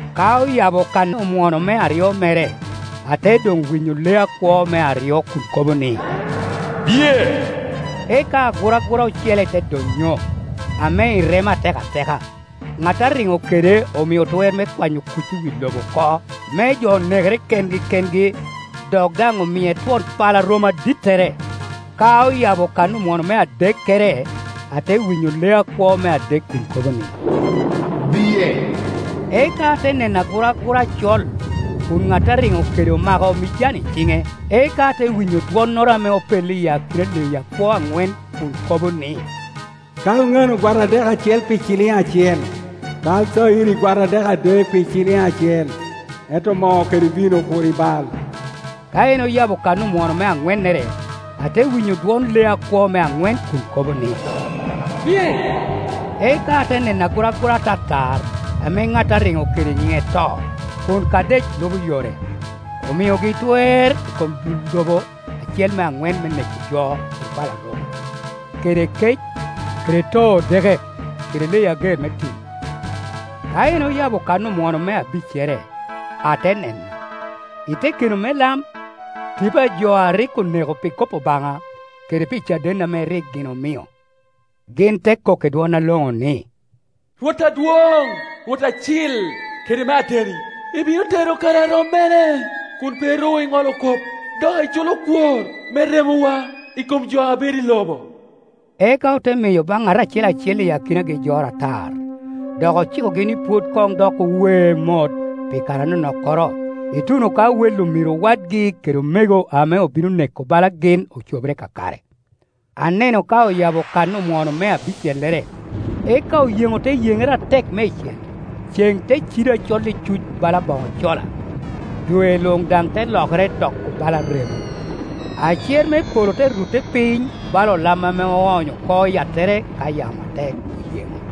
Ka oyabo kan omwono me aryo mere, ate doŋ winyo lee akwo me aryo kun kobo ni, “Biye!” Eka aguragura ocele te donnyo, ame irema atekateka, Ŋa a riŋo kede omio twer me kwanyo kuc i wi lobo oko, me jo nekere kengi kengi, dok daŋ omie twon pala romo adittere. Ka oyabo kan omwono me adekkere, ate winyo lee akwo me adek kun kobo ni, “Biye!” Eka ate neno aguragura acol, kun ŋat a riŋo kede omako mijan i ciŋe. Eka ate winyo dwonnoro ame opello iyi akina a leyi akwo aŋwen kun kobo ni, “Kal ŋano gwata dek acel pi ciliŋ acel, kal cayiri gwata dek adek pi ciliŋ acel, ento moo kede vino kur ibal!” Ka en oyabo kan omwono me aŋwennere, ate winyo dwon lee akwo me aŋwen kun kobo ni, “Biye!” Eka ate neno aguragura atatar, ame ŋat a riŋo kede nyiŋe To, kun Kadec lubo yore. Omiogi twer i kom dul lobo acel me aŋwen me neko jo i pala romo, kede i kec, kede too odeke, kede leyi ager me tim. Ka en oyabo kan omwono me abiccere, ate neno, i te keno me lam, tipo jo a rik oneko pi kop Obaŋa, kede pi caden ame rik gin omio. Gin te kok i dwon aloŋo ni, “Rwot Adwoŋ, Rwot acil kede me ateni, ibino tero kare a rom mene kun pe ru iŋolo kop dok iculo kwor me remowa i kom jo a bedo i lobo?” Eka ote miyo baŋ ŋat acel acel i akinagi jor atar, dok ocikogi ni pwod koŋ dok owe mot pi kare anonok koro, ituno ka wel omiro wadgi ke omego ame obino neko bala gin ocobere kakare. Aneno ka oyabo kan omwono me abicellere, eka oyeŋo te yeŋere atek meicel, ceŋ te cido acol icuc bala boŋo cola, dwe luŋ daŋ te lokere doko bala remo. Acer me polo te rutte piny bala olam ame oony oko i yattere ka yamo atek oyeŋo.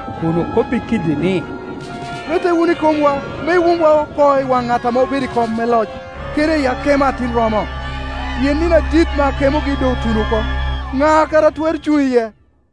kun okobbi kiddi ni, “Rette wunu i komwa, me iwumwa oko i waŋ ŋat ame obedo i kom me loc, kede i akemo Atin romo; pien nino adit me akemogi doŋ otuno oko, ŋa kara a twero cuŋ iye?”